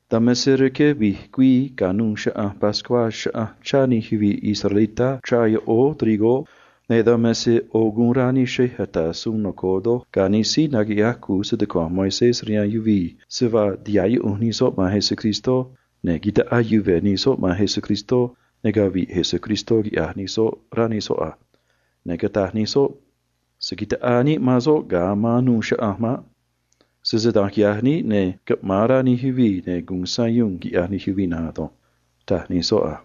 Dan me se rque vi̱j güii ca̱nuû Chaꞌanj Pascuá chaꞌanj chá nij yuvii̱ israelitá rachrúún ne atúj levadura, ne̱ dan me se ꞌo̱ guun rá nij xrej ata̱ suun noco̱o ga̱ nij síí naquiꞌyaj cu̱u stucua̱nj Moisés se vaa tiha̱ꞌ yuꞌunj nij soꞌ man Jesús, ne̱ ta̱ꞌaa yuve̱ nij soꞌ man Jesús, ne̱ cavi̱ꞌ Jesús, quiꞌya̱j nij soꞌ, rá nij soꞌ a. Ne̱ cataj nij soꞌ a: ―Se̱ taꞌaa níꞌ man soꞌ ga̱a anuû chaꞌanj maꞌ. Sese da̱nj quiꞌya̱j níꞌ, ne̱ caꞌma̱an rá nij yuvii̱, ne̱ gu̱un sayuun, quiꞌya̱j nij yuvii̱ na̱nj ado̱nj ―taj nij soꞌ a.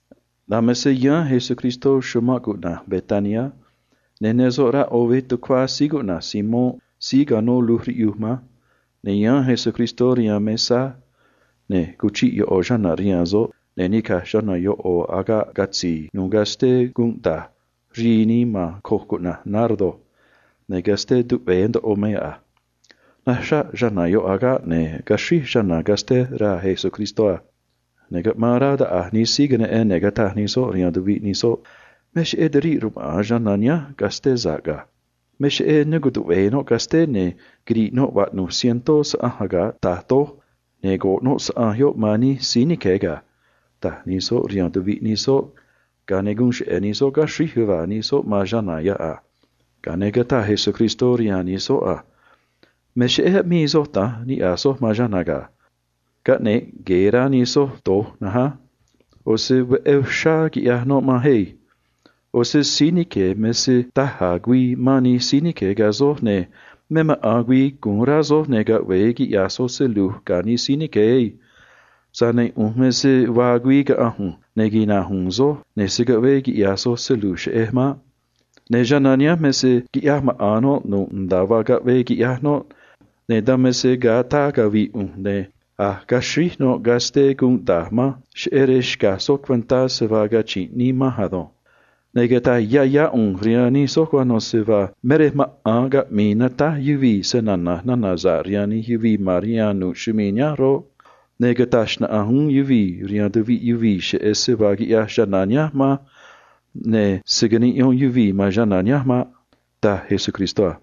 Dan me se yáán Jesús chumanꞌ Betania, ne̱ ne soꞌ rá ꞌo̱ veꞌ tucuá Simón síí quiranꞌ luj riꞌyuj a. Ne̱ yáán Jesús rihaan mesá, ne̱ cuchiꞌ ꞌo̱ chana̱ rihaan soꞌ, ne̱ nica̱j chana̱ ꞌo̱ agaꞌ catzi̱i̱ nu̱u̱ casté gunꞌ da̱j rii nii man coj cuꞌna̱j nardo, ne̱ casté tuꞌve̱e̱ ndoꞌo me yoꞌ a. Naxraꞌ chana̱ yoꞌ agaꞌ, ne̱ cutáj chana̱ casté raa̱ Jesús a. Ne̱ caꞌmaan rá taꞌa̱j nij síí queneꞌen, ne̱ cataj nij soꞌ rihaan tuviꞌ nij soꞌ a: ―Me cheꞌé tiriꞌ rmaꞌa̱n chana̱ nihánj casté sa̱ꞌ ga̱. Me cheꞌé ne cutuꞌve̱e̱ noꞌ casté, ne̱ quiri̱ꞌ noꞌ saꞌanj ase vaa ꞌyaj canaán yuvii̱ rque ꞌo̱ yoꞌ táá doj, ne̱ caxri̱i̱ noꞌ saꞌanj yoꞌ ston nij síí nique̱ ga̱ ―taj nij soꞌ rihaan tuviꞌ nij soꞌ, ga̱a ne̱ guun cheꞌe̱ nij soꞌ caxríj yuva̱a̱ nij soꞌ man chana̱ yoꞌ a. Ga̱a ne̱ cataj Jesús rihaan nij soꞌ a: ―Me cheꞌé aꞌmii soj da̱nj niꞌya̱j soj man chana̱ ga̱. Caꞌne̱ꞌ rá nij soj na̱nj á. ꞌO̱ se veꞌé uxrá quiꞌyaj noꞌ manj ado̱nj. ꞌO̱ se da̱j a̱ güii mán nij síí nique̱ ga̱ soj, ne̱ me maꞌa̱n güii gu̱un rá soj, ne̱ caꞌve̱e quiꞌya̱j soj se lu̱j ga̱ nij soꞌ ado̱nj. Tza̱j ne̱ ꞌu̱nj me se vaa güii caꞌa̱nj ꞌu̱nj, ne̱ se̱ caꞌvee quiꞌya̱j soj se lu̱j cheꞌej maꞌ. Ne̱ chana̱ nihánj quiꞌyaj nu̱ꞌ nda̱a vaa caꞌvee quiꞌyaj noꞌ, ne̱ dan me se ga̱a ataa cavi̱ꞌ ꞌu̱nj ne̱ a̱j caxríj noꞌ casté gunꞌ da̱j manj cheꞌé rej xca̱j soj cuentá se vaa nichrunꞌ güii cachi̱nꞌ nii manj ado̱nj. Ne̱ cata̱j yá yá ꞌu̱nj rihaan nij soj cuano̱ se vaa me rej maꞌa̱n caꞌmi̱i̱ natáj yuvii̱ snana̱j nana̱ sa̱ꞌ rihaan nij yuvii̱ ma̱n rihaan nu̱ꞌ chumii̱ nihánj roꞌ, ne̱ cata̱j xnaꞌanj uún yuvii̱ rihaan tuviꞌ yuvii̱ cheꞌé se vaa quiꞌyaj chana̱ nihánj manj, ne̱ se̱ niꞌyón yuvii̱ man noꞌ maꞌ ―taj Jesús a.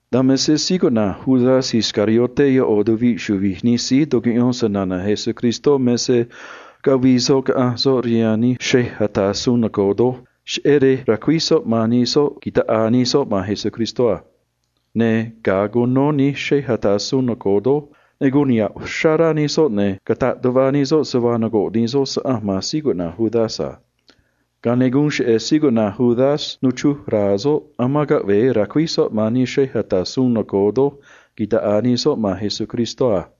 Ga̱a ne̱ Judas Iscariote ꞌo̱ chuvi̱j nij síí tucuꞌyón snana̱ Jesús me se caꞌanj soꞌ rihaan nij xrej ata̱ suun noco̱o, cheꞌé rej ra̱cuíj soꞌ man nij soꞌ ta̱ꞌaa nij soꞌ man Jesús a. Ne̱ ga̱a cuno nij xrej ata̱ suun noco̱o, ne̱ guun niha̱ꞌ uxrá rá nij soꞌ, ne̱ cataꞌ tuꞌva nij soꞌ se vaa rque̱ nij soꞌ saꞌanj man Judas a. Ga̱a ne̱ guun cheꞌe̱ Judas nuchruj ra̱a̱ soꞌ aman caꞌve̱e ra̱cuíj soꞌ man nij soꞌ ta̱ꞌaa nij soꞌ man Jesús a.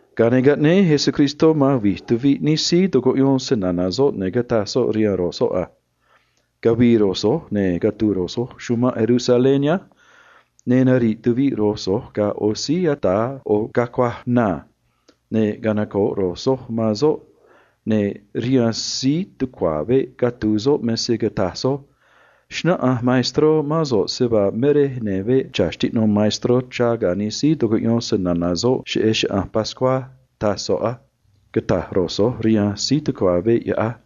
Ga̱a ne̱ caꞌnéé Jesús man vi̱j nij síí tucuꞌyón snana̱ soꞌ, ne̱ cataj soꞌ rihaan ro̱j soꞌ a: ―Cavi̱i̱ ro̱j so̱j, ne̱ catu̱u̱ ro̱j so̱j chumanꞌ Jerusalén nihánj, ne̱ nari̱ꞌ tuviꞌ ro̱j so̱j ga̱ ꞌo̱ síí ata̱ ꞌo̱ cacuaj na, ne̱ canoco̱ꞌ ro̱j so̱j man soꞌ a. Ne̱ rihaan síí tucua̱ veꞌ catu̱u̱ soꞌ me se cata̱j ro̱j so̱j a: “Xnáꞌanj se‑maestro̱ níꞌ mán so̱ꞌ me rej ne veꞌ cha̱ xtiꞌno̱ maestró ga̱ nij síí tucuꞌyón snana̱ soꞌ cheꞌé Chaꞌanj Pascuá, taj soꞌ a”, cata̱j ro̱j so̱j rihaan síí tucua̱ veꞌ yoꞌ á.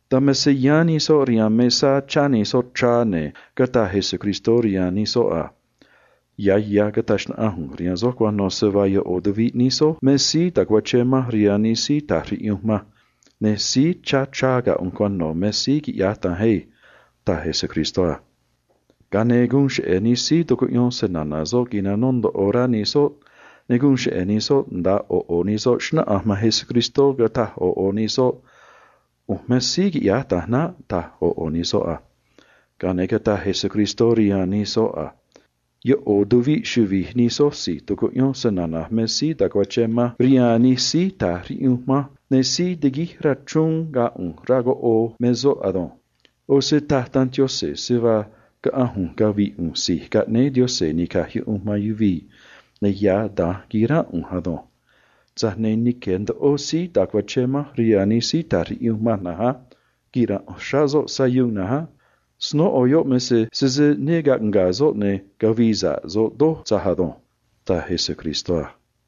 Dan me se yáán nij soꞌ rihaan mesá, chá nij soꞌ, ne̱ cataj Jesús a: ―Ya̱ ya̱ cata̱j xnaꞌanj ꞌu̱nj rihaan soj cuano̱ se vaa ꞌo̱ nij soj me síí ta̱cuachén manj rihaan nij síí ta̱j riꞌyunj manj, ne̱ síí chá ga̱ ꞌu̱nj cuano̱ me síí quiꞌya̱j da̱nj ado̱nj ―taj Jesús a. Ga̱a ne̱ guun cheꞌe̱ nij síí tucuꞌyón snana̱ soꞌ quinanó ndoꞌo rá nij soꞌ, ne̱ xnáꞌanj ꞌo̱ ꞌo̱ nij soꞌ man Jesús, cataj ꞌo̱ ꞌo̱ nij soꞌ a: ―ꞌU̱nj me síí quiꞌya̱j da̱nj naꞌ ―taj ꞌo̱ ꞌo̱ nij soꞌ a. Ga̱a ne̱ cataj Jesús rihaan nij soꞌ a: ―ꞌO̱ nij tuvi̱ꞌ chuvi̱j nij soj si̱j tucuꞌyón snana̱j me síí ta̱cuachén manj rihaan nij síí ta̱j riꞌyunj manj, ne̱ síí tiguíj rachrúún ga̱ ꞌu̱nj rá coꞌoo me soꞌ ado̱nj. ꞌO̱ se taj Danj Yaꞌanj se vaa caꞌa̱nj ꞌu̱nj cavi̱ꞌ ꞌu̱nj Si̱j Caꞌnéé Yaꞌanj Ni̱caj Yuꞌunj man Yuvii̱, ne̱ ya̱ da̱nj qui̱ránꞌ ꞌu̱nj ado̱nj. Tza̱j ne̱ nique̱ ndoꞌo síí ta̱cuachén manj rihaan nij síí ta̱j riꞌyunj manj na̱nj á. Quira̱nꞌ uxrá soꞌ sayuun na̱nj á. Snóꞌo yoꞌ me se sese ne caꞌnga̱a̱ soꞌ, ne̱ cavii sa̱ꞌ soꞌ doj tza̱j ado̱nj ―taj Jesús a.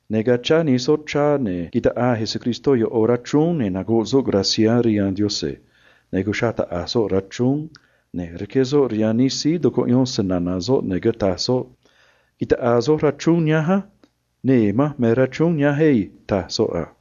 Ne̱ ga̱a chá nij soꞌ, ne̱ taꞌaa Jesús ꞌo̱ rachrúún, ne̱ cataj soꞌ guun niꞌya̱j níꞌ rihaan Yaꞌanj, ne̱ cuxraꞌ taꞌa̱j soꞌ rachrúún, ne̱ rqué soꞌ rihaan nij síí tucuꞌyón snana̱ soꞌ, ne̱ cataj soꞌ a: ―Ta̱ꞌaa soj rachrúún nihánj á. Nee̱ manj me rachrúún nihánj ado̱nj ―taj soꞌ a.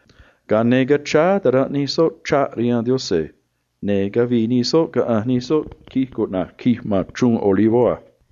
Ga̱a ne̱ cachráá ta̱ranꞌ nij soꞌ ꞌo̱ chraꞌ rihaan Yaꞌanj, ne̱ cavii nij soꞌ, caꞌanj nij soꞌ tacaan cuꞌna̱j Tacaan ma̱n Chruun Olivó a.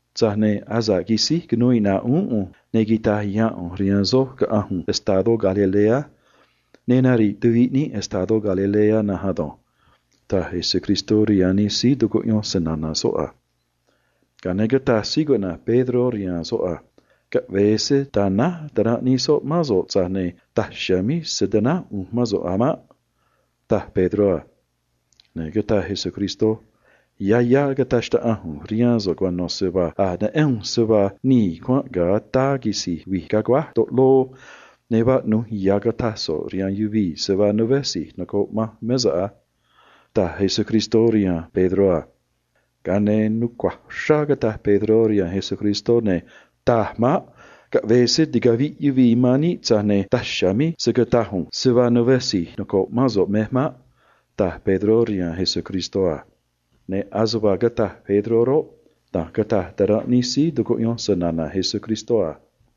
Tza̱j ne̱ asa̱ꞌ quisíj cunuu iꞌna̱ꞌ uún ꞌu̱nj, ne̱ quita̱j ya̱a̱n ꞌu̱nj rihaan soj caꞌa̱nj ꞌu̱nj estadó Galilea, ne̱ nari̱ꞌ tuviꞌ níꞌ estadó Galilea na̱nj ado̱nj ―taj Jesús rihaan nij soꞌ a. Ga̱a ne̱ cataj Pedró rihaan soꞌ a: ―Caꞌve̱e se ta̱náj ta̱ranꞌ nij soꞌ mán so̱ꞌ, tza̱j ne̱ daj chiha̱a̱ míj se̱ tanáj ꞌu̱nj mán so̱ꞌ maꞌ ―taj Pedró a. Ne̱ cataj Jesús a: ―Ya̱ ya̱ cata̱j xnaꞌanj ꞌu̱nj rihaan so̱ꞌ cuano̱ se vaa a̱j neꞌén ꞌu̱nj se vaa nii̱ cuanꞌ ga̱a ataa quisi̱j vi̱j aguáj taꞌloo, ne̱ vaꞌnu̱j ya̱ cata̱j so̱ꞌ rihaan yuvii̱ se vaa né si̱j noco̱ꞌ manj mé so̱ꞌ a ―taj Jesús rihaan Pedró a. Ga̱a ne̱ nucua̱j uxrá cataj Pedró rihaan Jesús a: ―Taj maꞌ. Caꞌve̱e se ticavi̱ꞌ yuvii̱ man níꞌ, tza̱j ne̱ daj chiha̱a̱ míj se̱ cataj ꞌu̱nj se vaa né si̱j noco̱ꞌ mán so̱ꞌ mej maꞌ ―taj Pedró a. Ne̱ veé da̱nj cataj ta̱ranꞌ nij síí tucuꞌyón snana̱ Jesús uún a.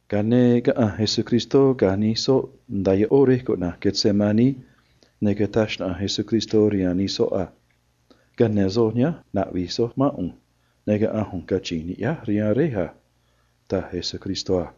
Ga̱a ne̱ caꞌanj Jesús ga̱ nij síí tucuꞌyón snana̱ soꞌ nda̱a ꞌó rej cuꞌna̱j Getsemaní, ne̱ cataj xnaꞌanj Jesús rihaan nij soꞌ a: ―Ca̱yáán soj nihánj, na̱ꞌvi̱j soj mán ꞌu̱nj, ne̱ caꞌa̱nj ꞌu̱nj, cachi̱nj ni̱ꞌyáj rihaan Réj a ―taj Jesús a.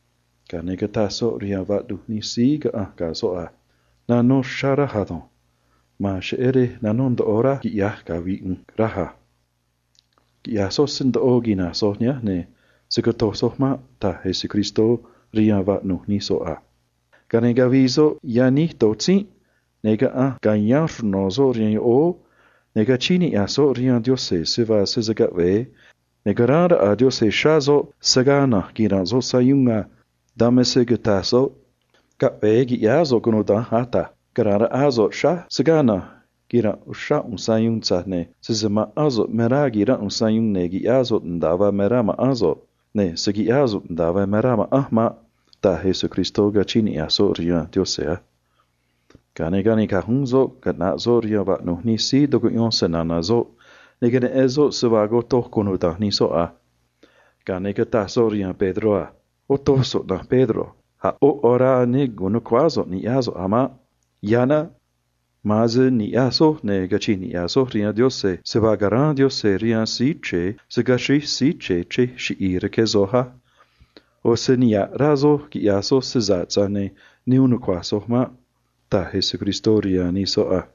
Ga̱a ne̱ cataj soꞌ rihaan nij soꞌ a: ―Nanó uxrá rá nimanj ado̱nj. Ma̱an cheꞌé rej nanó ndoꞌo rá nimanj, quiꞌya̱j cavi̱ꞌ ꞌu̱nj, raj a. Quina̱j soj nihánj, ne̱ se̱ cotoj soj maꞌ ―taj Jesús a. Ga̱a ne̱ cavii soꞌ yaníj do̱j tzínꞌ, ne̱ caꞌanj ca̱yáán ru̱j soꞌ nda̱a canó rihaan soꞌ rihaan yoꞌóó, ne̱ cachíín niꞌya̱j soꞌ rihaan Yaꞌanj se vaa sese caꞌve̱e, ne̱ ca̱ráán raꞌa Yaꞌanj xráá soꞌ, se̱ gaa na̱nj quira̱nꞌ soꞌ sayuun a. Dan me se cataj soꞌ a: ―Caꞌve̱e qui̱ꞌyáá so̱ꞌ cunuda̱nj, Ata̱j. Ca̱ráán raꞌá so̱ꞌ xráj, se̱ gaa na̱nj quira̱nꞌ uxrá ꞌu̱nj sayuun, tza̱j ne̱ sese ma̱ꞌán so̱ꞌ me rá qui̱ránꞌ ꞌu̱nj sayuun, ne̱ qui̱ꞌyáá so̱ꞌ nda̱a vaa me rá ma̱ꞌán so̱ꞌ, ne̱ se̱ quiꞌyáá so̱ꞌ nda̱a vaa me rá ma̱ꞌanj maꞌ ―taj Jesús, cachíín niꞌya̱j soꞌ rihaan Yaꞌanj a. Ga̱a ne̱ canica̱j uún soꞌ caꞌnaꞌ soꞌ rihaan vaꞌnu̱j nij síí tucuꞌyón snana̱ soꞌ, ne̱ queneꞌen soꞌ se vaa cotoj nij soꞌ a. Ga̱a ne̱ cataj soꞌ rihaan Pedró a: ―Otoj so̱ꞌ, na̱nj Pedro. A̱ ꞌó ya̱ orá ne gu̱un nu̱cuáá so̱ꞌ ni̱ꞌyaj so̱ꞌ a̱ maꞌ. Ma̱an se ni̱ꞌyaj soj, ne̱ cachi̱nj niꞌya̱j soj rihaan Yaꞌanj se vaa ca̱ráán Yaꞌanj rihaan Síí Chre̱e se̱ caxríj Síí Chre̱e chrej chiꞌi̱i̱ rque soj á. ꞌO̱ se me rá nimán soj quiꞌya̱j soj se sa̱ꞌ, tza̱j ne̱ ne uun nucua̱j soj maꞌ ―taj Jesús a.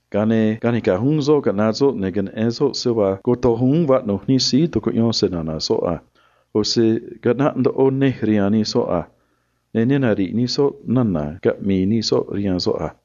Ga̱a ne̱ canica̱j uún soꞌ caꞌnaꞌ soꞌ, ne̱ queneꞌen soꞌ se vaa cotoj uún vaꞌnu̱j nij síí tucuꞌyón snana̱ soꞌ a. ꞌO̱ se caꞌnaꞌ ndoꞌo nej rihaan nij soꞌ a. Ne̱ ne nari̱ꞌ nij soꞌ nana̱ cata̱j nij soꞌ rihaan soꞌ a̱ maꞌ.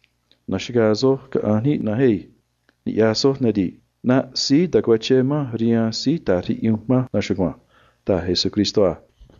Na̱xagaa soj, caꞌa̱nj níꞌ na̱nj á. Ni̱ꞌyaj soj á. ꞌNaꞌ síí ta̱cuachén manj rihaan síí ta̱j riꞌyunj manj na̱nj chugua̱nj ―taj Jesús a.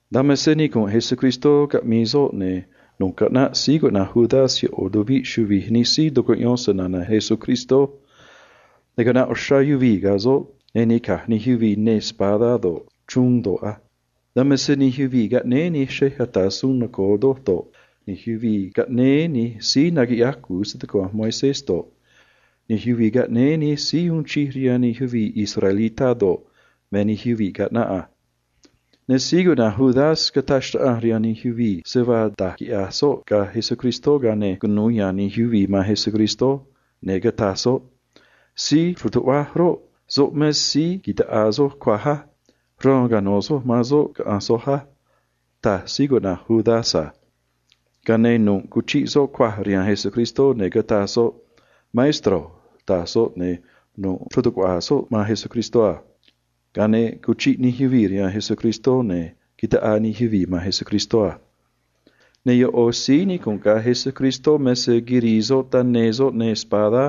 Dan me se nicu̱nꞌ Jesús caꞌmii soꞌ, ne̱ nu̱ꞌ caꞌnaꞌ Judas ꞌo̱ nij chuvi̱j nij síí tucuꞌyón snana̱ Jesús, ne̱ caꞌnaꞌ uxrá yuvii̱ ga̱ soꞌ, ne̱ nica̱j nij yuvii̱ neê espadá do̱ꞌ, chruun do̱ꞌ a. Dan me se yuvii̱ caꞌnéé nij xrej ata̱ suun noco̱o do̱ꞌ, nij síí naquiꞌyaj cu̱u stucua̱nj Moisés do̱ꞌ, nij síí uun chij rihaan nij yuvii̱ israelitá do̱ꞌ, me nij soꞌ a. Ne̱ Judas roꞌ, cataj xnaꞌanj rihaan nij yuvii̱ da̱j quiꞌya̱j soꞌ ga̱ Jesús, ga̱a ne̱ cunu̱u ya̱a̱n nij yuvii̱ man Jesús, ne̱ cataj soꞌ a: ―Síí ru̱tuꞌvaj roꞌ, soꞌ me síí ta̱ꞌaa soj cuaj á. Raan cano̱ soj man soꞌ, caꞌa̱nj soj á ―taj Judas a. Ga̱a ne̱ nu̱ꞌ cuchiꞌ soꞌ cuaj rihaan Jesús, ne̱ cataj soꞌ a: ―Maestro ―taj soꞌ a. Ne̱ nu̱ꞌ cachrón tuꞌva̱ soꞌ xruu̱ Jesús a. Ga̱a ne̱ cuchiꞌ nij yuvii̱ rihaan Jesús, ne̱ taꞌaa nij yuvii̱ man soꞌ a. Ne̱ ꞌo̱ síí nicu̱nꞌ ga̱ Jesús me se quirii soꞌ taneê soꞌ neê espadá,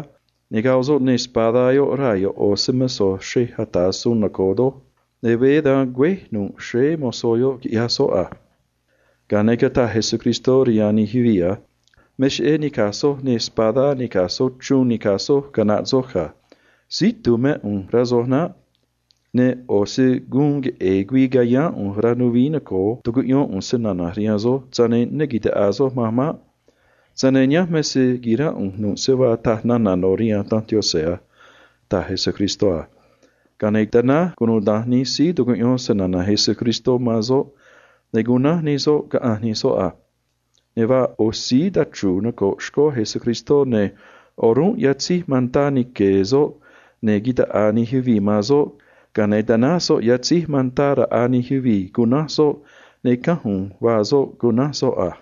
ne̱ goꞌ soꞌ neê espadá yoꞌ raa̱ ꞌo̱ se‑mo̱zó xrej ata̱ suun noco̱o doj, ne̱ veé dan güéj nu̱ꞌ nuj xréé mozó yoꞌ, quiꞌyaj soꞌ a. Ga̱a ne̱ cataj Jesús rihaan nij yuvii̱ a: ―Me cheꞌé nica̱j soj neê espadá nica̱j soj chruun nica̱j soj, caꞌnaꞌ soj ga̱. Síí itu̱u̱ mé ꞌu̱nj, rá soj naꞌ. ꞌO̱ se guun queꞌe̱e̱ güii cayáán ꞌu̱nj rihaan rej ya̱nj nuvií noco̱o, tucuꞌyón ꞌu̱nj snana̱j rihaan soj, tza̱j ne̱ ne ta̱ꞌaa soj manj maꞌ. Tza̱j ne̱ nihánj me se qui̱ránꞌ ꞌu̱nj nu̱ꞌ se vaa taj nana̱ no̱ rihaan Danj Yaꞌanj a ―taj Jesús a. Ga̱a ne̱ tanáj cunuda̱nj nij síí tucuꞌyón snana̱ Jesús man soꞌ, ne̱ cunánj nij soꞌ, caꞌanj nij soꞌ a. Ne̱ vaa ꞌo̱ síí tachru̱u̱ noco̱ꞌ xcó Jesús, ne̱ o̱rúnꞌ yatzéj mantá nique̱e̱ soꞌ, ne̱ taꞌaa nij yuvii̱ man soꞌ, ga̱a ne̱ tanáj soꞌ yatzéj mantá raꞌa nij yuvii̱, cunánj soꞌ, ne̱ cánj u̱u̱n vaa soꞌ, cunánj soꞌ a.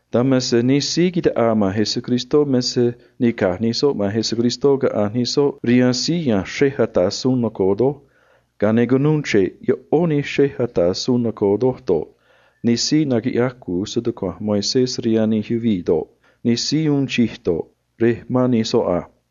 Dan me se nij síí taꞌaa man Jesús me se nica̱j nij soꞌ man Jesús caꞌanj nij soꞌ rihaan síí ya̱nj xrej ata̱ suun noco̱o doj, ga̱a ne̱ cunuu chre̱ꞌ ꞌó nij xrej ata̱ suun noco̱o do̱ꞌ, nij síí naquiꞌyaj cu̱u stucua̱nj Moisés do̱ꞌ, nij síí uun chij do̱ꞌ, rej ma̱n nij soꞌ a.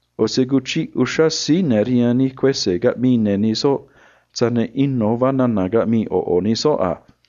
ꞌO̱ se cuchiꞌ uxrá síí ne̱ rihaan nij síí ata̱ suun caꞌmii ne̱ nij soꞌ, tza̱j ne̱ ino̱ vaa nana̱ caꞌmii ꞌo̱ ꞌo̱ nij soꞌ a.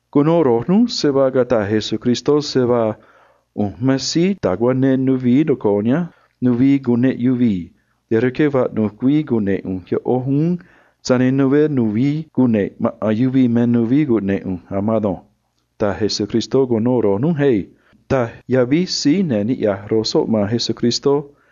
―Cuno núj se vaa cataj Jesús a: “ꞌU̱nj me síí ta̱cuanee nuvií noco̱o nihánj nuvií cuneꞌ yuvii̱, ne̱ rque vaꞌnu̱j güii cune̱ꞌ ꞌu̱nj ꞌó nuvií uún, tza̱j ne̱ né nu̱vií cune̱ꞌ maꞌa̱n yuvii̱ me nuvií cune̱ꞌ ꞌu̱nj a̱ maan ado̱nj”, taj Jesús cuno núj na̱nj á ―taj síí ne̱ niꞌya̱j nij soꞌ man Jesús a.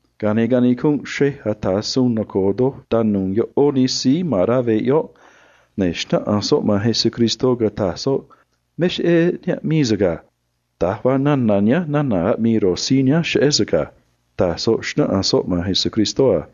Ga̱a ne̱ canicunꞌ xrej ata̱ suun noco̱o doj tanu̱u̱ ꞌó nij síí ma̱n rá veꞌ yoꞌ, ne̱ xnáꞌanj soꞌ man Jesús a: ―Me cheꞌé ne aꞌmii so̱ꞌ ga̱. Da̱j vaa nana̱ nihánj nana̱ aꞌmii nij síí nihánj cheꞌé so̱ꞌ ga̱ ―taj soꞌ a.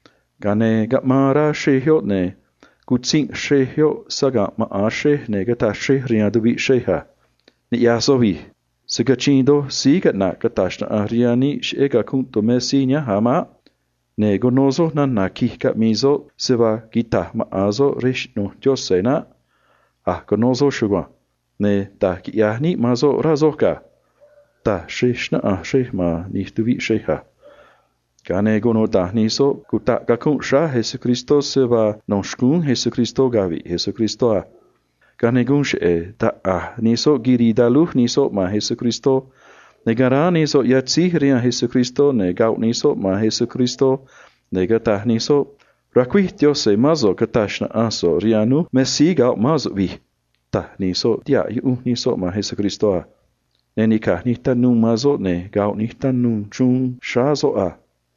Ga̱a ne̱ caꞌmaan rá xrej yoꞌ, ne̱ cutzinꞌ xrej yoꞌ saga̱nꞌ maꞌa̱n xrej, ne̱ cataj xrej rihaan tuviꞌ xrej a: ―Se̱ cachiin a̱ doj síí caꞌna̱ꞌ cata̱j xnaꞌanj rihaan níꞌ cheꞌé cacunꞌ tumé síí nihánj a̱ maꞌ. Ne̱ cuno soj nana̱ qui̱j caꞌmii soꞌ se vaa quita̱j maꞌa̱n soꞌ rej xꞌnu̱j Yaꞌanj naꞌ. A̱j cuno soj chugua̱nj. Ne̱ da̱j quiꞌya̱j níꞌ man soꞌ, rá soj ga̱ ―taj xrej a. Ga̱a ne̱ cataj cunuda̱nj nij soꞌ se vaa ya̱ tumé Jesús cacunꞌ, ne̱ no̱ xcúún soꞌ cavi̱ꞌ soꞌ a. Ga̱a ne̱ guun cheꞌe̱ taꞌa̱j nij soꞌ quirii talúj nij soꞌ man Jesús, ne̱ caráán nij soꞌ yatzéj rihaan Jesús, ne̱ goꞌ nij soꞌ man Jesús, ne̱ cataj nij soꞌ a: ―Sese ya̱ síí nataꞌ snana̱ Yaꞌanj mé so̱ꞌ, ne̱ cata̱j xnaꞌanj so̱ꞌ rihaan núj me síí goꞌ mán so̱ꞌ vi̱j ―taj nij soꞌ, tihaꞌ yuꞌunj nij soꞌ man Jesús a. Ne̱ nica̱j nij tanuu man soꞌ, ne̱ goꞌ nij tanuu man soꞌ a.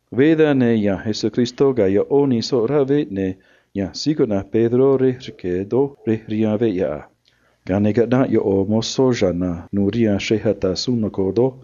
Veé dan, ne̱ ya̱nj Jesús ga̱ ꞌó nij soꞌ rá veꞌ, ne̱ ya̱nj Pedró rej rque̱ doj rej rihaan veꞌ yoꞌ a. Ga̱a ne̱ caꞌnaꞌ ꞌo̱ mozó cha̱na̱ nu̱u̱ rihaan xrej ata̱ suun noco̱o doj,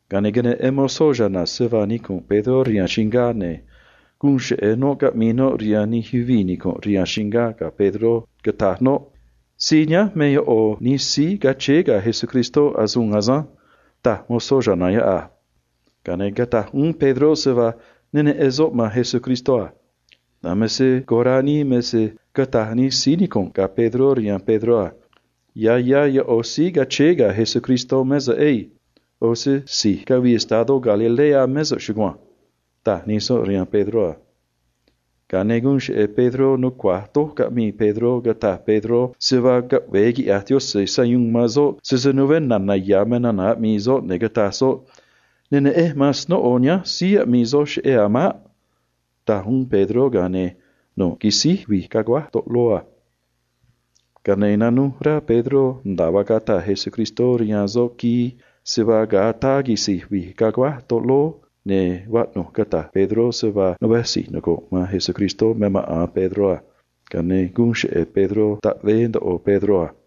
Ga̱a ne̱ queneꞌen mozó cha̱na̱ se vaa nicu̱nꞌ Pedró rihaan chingá, ne̱ guun cheꞌe̱ noꞌ caꞌmii noꞌ rihaan nij yuvii̱ nicu̱nꞌ rihaan chingá ga̱ Pedró, cataj noꞌ a: ―Síí nihánj me ꞌo̱ nij síí cachéé ga̱ Jesús asânj ―taj noꞌ a. Ga̱a ne̱ cataj uún Pedró se vaa ne neꞌen soꞌ man Jesús a. Dan me se corá nii doj me se cataj nij síí nicu̱nꞌ ga̱ Pedró rihaan Pedró a: ―Ya̱ ya̱ ꞌo̱ síí cachéé ga̱ Jesús mé so̱ꞌ ado̱nj. ꞌO̱ se si̱j cavii estadó Galilea mé so̱ꞌ chugua̱nj ―taj nij soꞌ rihaan Pedró a. Ga̱a ne̱ guun cheꞌe̱ Pedró nucua̱j doj caꞌmii Pedró, cataj Pedró se vaa caꞌve̱e quiꞌya̱j Yaꞌanj sayuun man soꞌ sese né na̱na̱ ya̱ me nana̱ aꞌmii soꞌ, ne̱ cataj soꞌ a: ―Ne neꞌenj man snóꞌo nihánj síí aꞌmii soj cheꞌé a̱ maꞌ ―taj uún Pedró a. Ga̱a ne̱ nu̱ꞌ quisíj vi̱j caguáj taꞌloo a. Ga̱a ne̱ nanuj rá Pedró nda̱a vaa a̱j cataj Jesús rihaan soꞌ quii se vaa ga̱a ataa quisi̱j vi̱j caguáj taꞌloo, ne̱ vaꞌnu̱j cata̱j Pedró se vaa né si̱j noco̱ꞌ man Jesús me maꞌa̱n Pedró a. Ga̱a ne̱ guun cheꞌe̱ Pedró taꞌvee ndoꞌo soꞌ a.